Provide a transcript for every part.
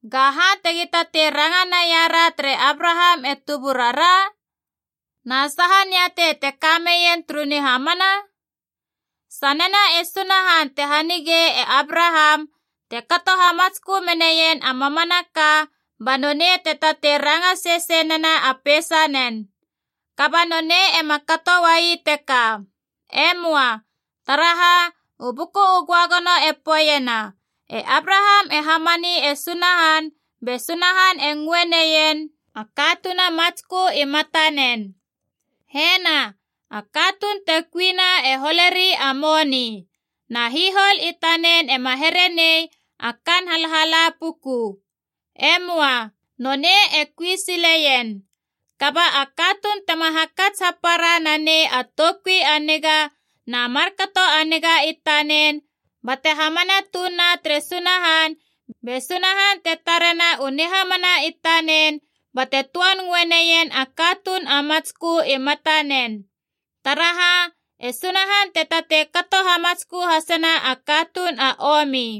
Gaha tegi tatei ranga naia ra tere Abraham e tuburara? Na saha niatei te ka meien turu nihamana? Sanena e Sunahan te hanigei e Abraham te kato hamatskö menaien a mamanaka, ba nonei te tatei ranga sesei nena a peisanen. Kaba nonei ema kato uai teka. E möa. Taraha, u Buku u Göagono e poeiena, “E Abraham e hamani e Sunahan be Sunahan e ngöe neien a katuun a matskö i matanen.” Hena, a katuun te kuina e holeri a moni. Na hihol i tanen ema here nei a kaan halhala puku. E möa. Nonei e kui sileien. Kaba a katuun tema hakats hapara nanei a toukui a niga na markato a niga i tanen bate hamana tuun na tere Sunahan, be Sunahan te tarena u nihamana i tanen bate töan ngöe neien a katuun a matskö i matanen. Taraha, e Sunahan te tatei kato hamatskö hasena a katuun a omi.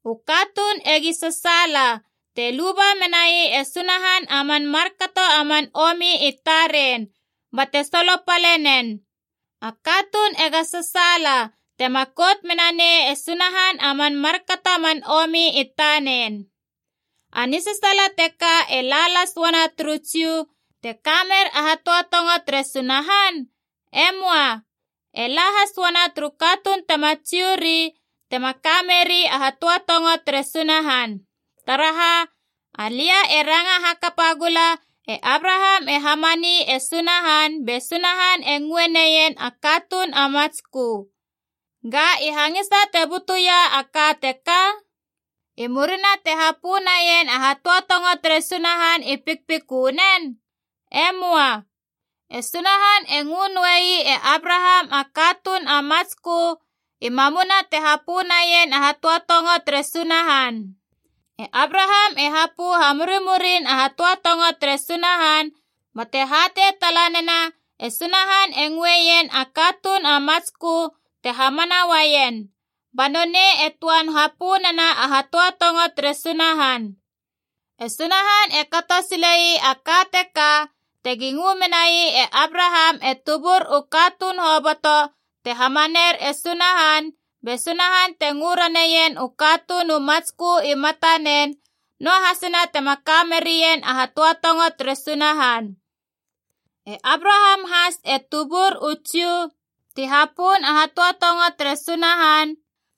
“U katuun egi sasaala te luba menai e Sunahan a man markato a man omi i taren, bate solopale nen. A katuun ega sasaala tema kout mena nei e Sunahan a man markato a man omi i tanen.” A nisasaala teka e la las uana turu Jiu, te ka mer a hatöatongo tere Sunahan? E möa. E la has uana turu katuun tema Jiu ri tema ka meri a hatöatongo tere Sunahan. Taraha, alia e ranga hakapa gula e Abraham e hamani e Sunahan be Sunahan e ngöe neien a katuun a matskö. Ga i hangisa te butuia a ka teka? I murina te hapö naien a hatöatongo tere Sunahan i pikpikönen? E möa. E Sunahan e ngö noei e Abraham a katuun a matskö i mamuna te hapö naien a hatöatongo tere Sunahan. E Abraham e hapö hamurimurin a hatöatongo tere Sunahan, bate hatei tala nena e Sunahan e ngöeien a katuun a matskö te hamana uaien, ba nonei e töan hapö nena a hatöatongo tere Sunahan. E Sunahan e kato sile ii a ka teka tegi ngö menai e Abraham e tubur u katuun hoboto te hamaner e Sunahan be Sunahan te ngö raneien u katuun u matskö i matanen, noahasina tema ka merien a hatöatongo tere Sunahan. E Abraham has e tubur u Jiu ti hapön a hatöatongo tere Sunahan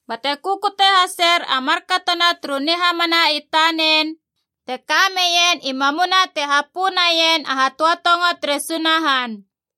bate kukute haser a markatona turu nihamana i tanen, te ka meien i mamuna te hapö naien a hatöatongo tere Sunahan.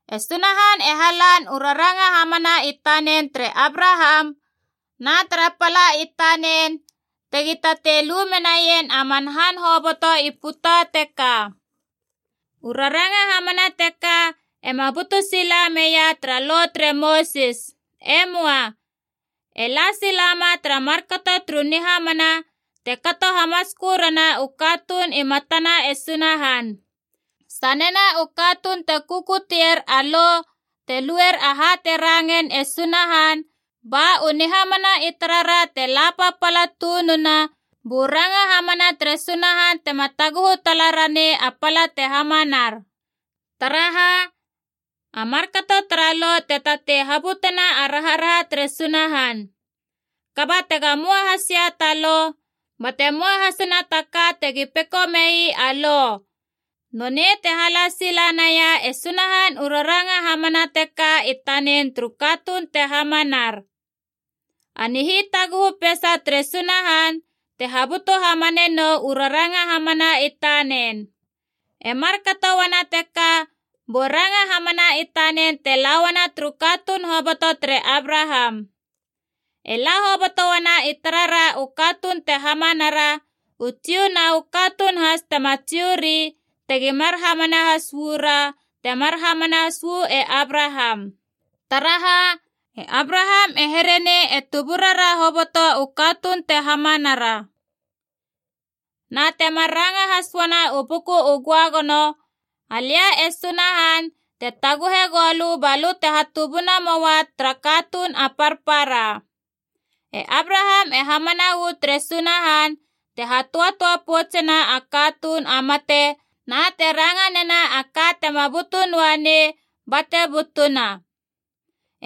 E Sunahan e halan u raranga hamana i tanen tere Abraham na tara pala i tanen tegi tatei lu menaien a man han hoboto i puta teka. U raranga hamana teka ema butu sila meia tara Lo tere Mosis. E möa. E la silama tara markato turu nihamana te kato hamatskö rana u katuun i matana e Sunahan. Sanena u katuun te kukutier a Lo te luer aha te rangein e Sunahan, ba u nihamana i tarara te la papala tununa bu ranga hamana tere Sunahan tema taguhu tala ranei a pala te hamanar. Taraha, a markato tara Lo te tatei habutena a raharaha tere Sunahan. Kaba tega möa has ia ta Lo, bate möa hasina ta ka tegi peko mei a Lo. Nonei te hala sila naia e Sunahan u raranga hamana teka i tanen turu katuun te hamanar. A nihitaguhu peisa tere Sunahan te habutu hamane nou u raranga hamana i tanen. E markato uana teka bu ranga hamana i tanen te la uana turu katuun hoboto tere Abraham. E la hoboto uana i tarara u katuun te hamanara, u Jiu na u katuun has tema Jiu ri, tegi mar hamana uu ra temar hamana uu e Abraham. Taraha, e Abraham e here nei e tuburara hoboto u katuun te hamanara. Na temar ranga has uana u Buku u Göagono, “Alia e Sunahan te taguhe goulö ba lö te hatubuna moa tara katuun a parpara.” E Abraham e hamana uu tere Sunahan te hatöatöa poutsena a katuun a mate na te ranga nena a ka tema butu noa nei bate butuna.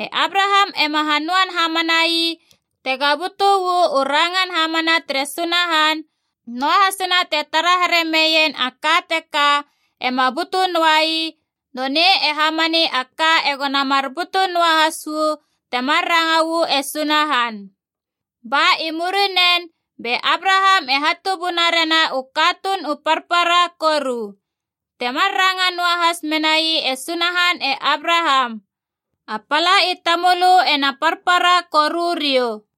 E Abraham ema hanöan hamana ii tega butu uu rangan hamana tere Sunahan, noahasina te tara here meien a ka teka ema butu noi, nonei e hamani a ka egona mar butu noahas uu temar ranga uu e Sunahan. Ba i murinen be Abraham e hatubuna rena u katuun u parpara koru. Temar ranga noahas menai e Sunahan e Abraham, “A pala i tamölö ena parpara koru riou.”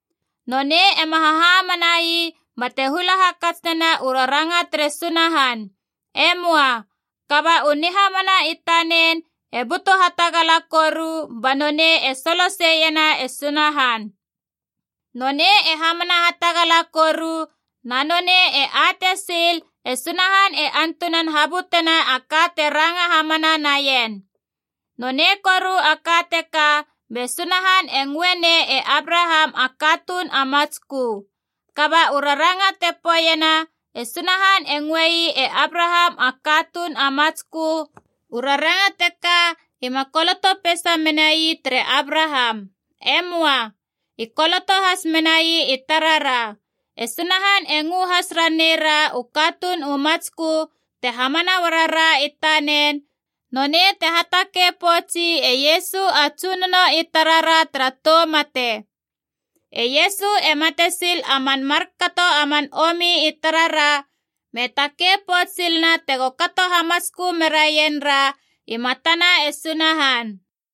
Nonei ema hahamana ii bate hula hakats nena u raranga tere Sunahan. E möa. Kaba u nihamana i tanen e butu hatagala koru, ba nonei e soloseiena e Sunahan. Nonei e hamana hatagala koru, na nonei e atei sil e Sunahan e antunan habutena a ka te ranga hamana naien. Nonei koru a ka teka be Sunahan e ngöe nei e Abraham a katuun a matskö. Kaba u raranga te poeiena, “E Sunahan e ngöei e Abraham a katuun a matskö,” u raranga teka ima koloto peisa menai tere Abraham. E möa. I koloto has menai i tarara. E Sunahan e ngö has ranei ra u katuun u matskö te hamana uarara i tanen, nonei te hatakei poutsi e Iesu a Tsunono i tarara tara tou mate. E Iesu e mate sil a man markato a man omi i tarara me takei pouts silena tego kato hamatskö meraien ra i matana e Sunahan.